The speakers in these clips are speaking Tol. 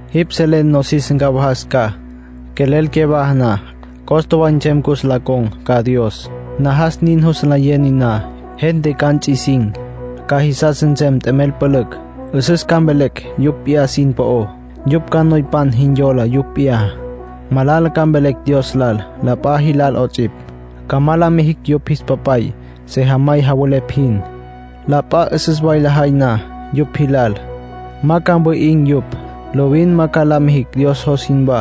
Jipj selen nosis ncawajas ca. Quelel cyawaja na, costa way nsem cus ncon̈cocj ca Dios. Najas nin jus nlayen niná. Gente ca nts'isin̈. Ca jisas nsem t'emel pülücj. 'Üsüs ca mvelecj yupj p'iyá sin po'ó. Yupj ca noypan jin yola yupj p'iyá. Malala ca mvelecj Dios lal, la p'a jilal 'ots'ipj. Ca ma la mijicj yupj jis papay, sejamay javelepj jin. La p'a 'üsüs way lajay na yupj jilal, ma ca mwi'in̈ yupj. Lovin ma ca la mijicj Dios jos jinwá.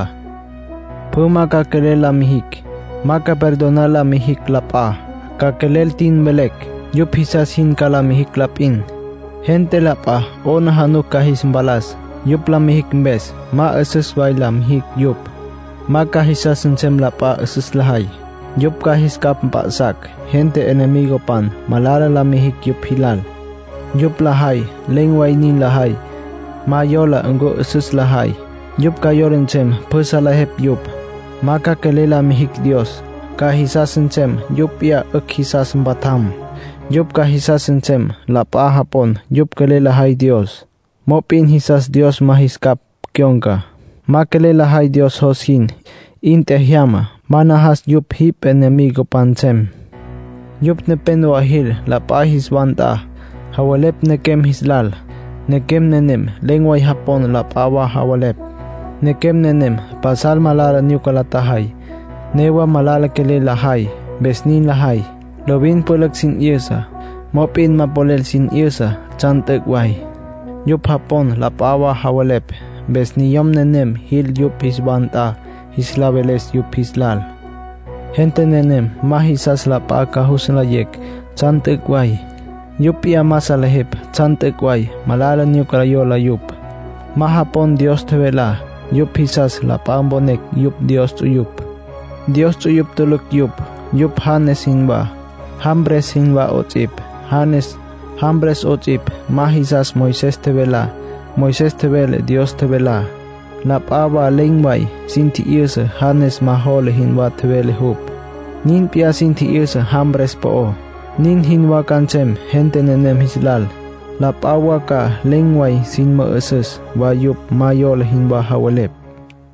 Pjü ma ca quelel la mijicj. Ma ca perdonar la mijicj la p'a. Ca quelel tin mvelecj. Yupj jisas jin ca la mijicj la p'in. Gente la p'a 'aplijila ca jis mpalas, yupj la mijicj mpes. Ma 'üsüs la mijicj yupj. Ma ca jisas nsem la p'a 'üsüs lajay. Yupj ca jis capj mp'a'sacj gente enemigopan malala la mijicj yupj jilal. Yupj lajay, len̈ way nin lajay, ma yola ncu 'üsüs lajay. Yupj ca yola nsem pjü salejepj yupj. Ma ca quelel la mijicj Dios. Ca jisas nsem yupj p'iyá 'ücj jisas mpatjam. Yupj ca jisas nsem la p'a japon yupj quelel lajay Dios. Mop'in jisas Dios ma jis capj cyon̈ca. Ma quelel lajay Dios jos jin. 'In tjejyama. Ma najas yupj jipj jemicapan nsem. Yupj nepénowa jil la p'a jis wa nt'a, javelepj nequem jis lal. Nequem nenem len̈ way japon la p'a wa javelepj. Nequem nenem pasal malala nyuca la tjajay. Newa malala quelel lajay, mpes nin lajay. Lovin pülücj sin 'yüsa, mop'in ma polel sin 'yüsa tsjan t'üc' way. Yupj japon la p'a wa javelepj, mpes niyom nenem jil yupj jis wa nt'a jis la veles yupj jis lal. Gente nenem ma jisas la p'a ca jus nlayecj tsjan t'üc' way. Yupj p'iyá ma salejepj tsjan t'üc' way. Malala nyuca yola yupj. Ma japon Dios tjevelá. Yupj jisas la p'a mponecj yupj Dios ts'uyupj; Dios ts'uyupj tulucj yupj. Yupj Janes jinwá, Jambres jinwá 'ots'ipj. Janes, Jambres 'ots'ipj, ma jisastsja Moisés tjevelá. Moisés tjevele Dios tjevelá. La p'a wa len̈ way sin tji'yüsa Janes ma jola jinwá tjevele jupj. Nin p'iyá sin tji'yüsa Jambres po'ó. Nin jinwá ca nsem gente nenem jis lal. La p'a wa ca len̈ way sin mü'üsüs wa yupj ma yola jinwá javelepj.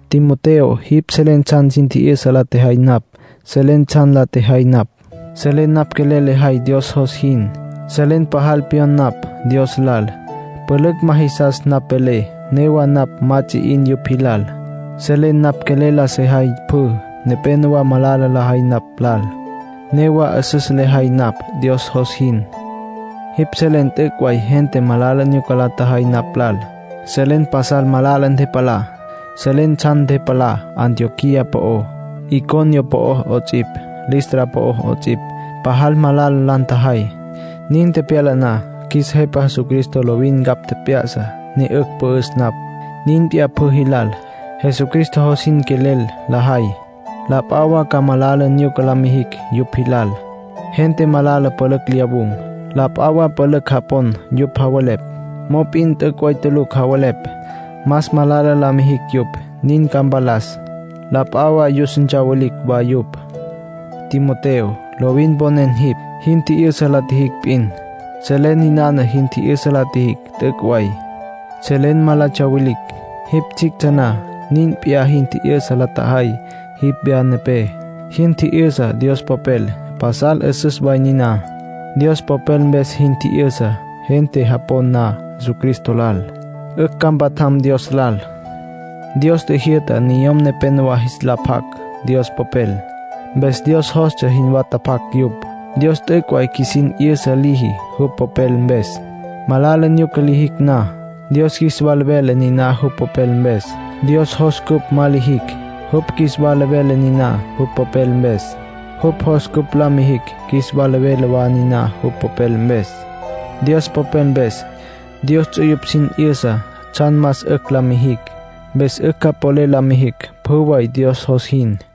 Timoteo, jipj selen tsjan sin tji'yüsa la tjejay napj. Selen tsjan la tjejay napj. Selen napj quelel lejay Dios jos jin. Selen pajal pyon napj Dios lal. Pülücj ma jisas napj velé, newa napj ma ts'i 'in yupj jilal. Selen napj quelel la sejay pjü. Nepénowa malala lajay napj lal, newa 'üsüs lejay napj Dios jos jin. Jipj selen t'üc' way gente malala nyuca la tjajay napj lal. Selen pasal malala ntepalá. Selen tsjan ntepalá Antioquía po'ó, Iconio po'ó 'ots'ipj, Listra po'ó 'ots'ipj. Pajal malala la ntjajay. Nin tepyala na, qjuis Jepa Jesucristo lovin ncapj tjep'ya'sa, ne 'ücj pü'üs napj. Nin p'iyá pjü jilal. Jesucristo jos jin quelel lajay, la p'a wa ca malala nyuca la mijicj yupj jilal. Gente malala pülücj lyawun̈. La p'a wa pülücj japon yupj javelepj. Mop'in t'üc' way tulucj javelepj. Más malala la mijicj yupj, nin ca mpalas. La p'a wa yus ntsawilicj wa yupj. Timoteo, lovin mponen jipj, jin tji'yüsa la tjijicj p'in. Selen ninana jin tji'yüsa la tjijicj t'üc' way. Selen ma la tsyawilicj. Jipj tsjictsja na, nin p'iyá jin tji'yüsa la tjajay jipj wya nepé. Jin tji'yüsa Dios Popel, pasal 'üsüs way niná. Dios Popel mpes jin tji'yüsa gente japon na Jesucristo lal, 'ücj ca mpatjam Dios lal. Dios tjijyü'ta niyom nepenowá jis la pac Dios Popel. Mpes Dios jostsja jinwá tapac yupj. Dios t'üc' way qjuisin 'yüsa liji jupj Popel mpes. Malala nyuca lijicj na, Dios qjuis wala vele niná jupj Popel mpes. Dios jos cupj ma lijicj, jupj qjuis wala vele niná jupj Popel mpes. Jupj jos cupj la mijicj, qjuis wala vele wa niná jupj Popel mpes. Dios Popel mpes, Dios ts'uyupj sin 'yüsa tsjan más 'ücj la mijicj. Mpes 'ücj ca polel la mijicj pjü way Dios jos jin.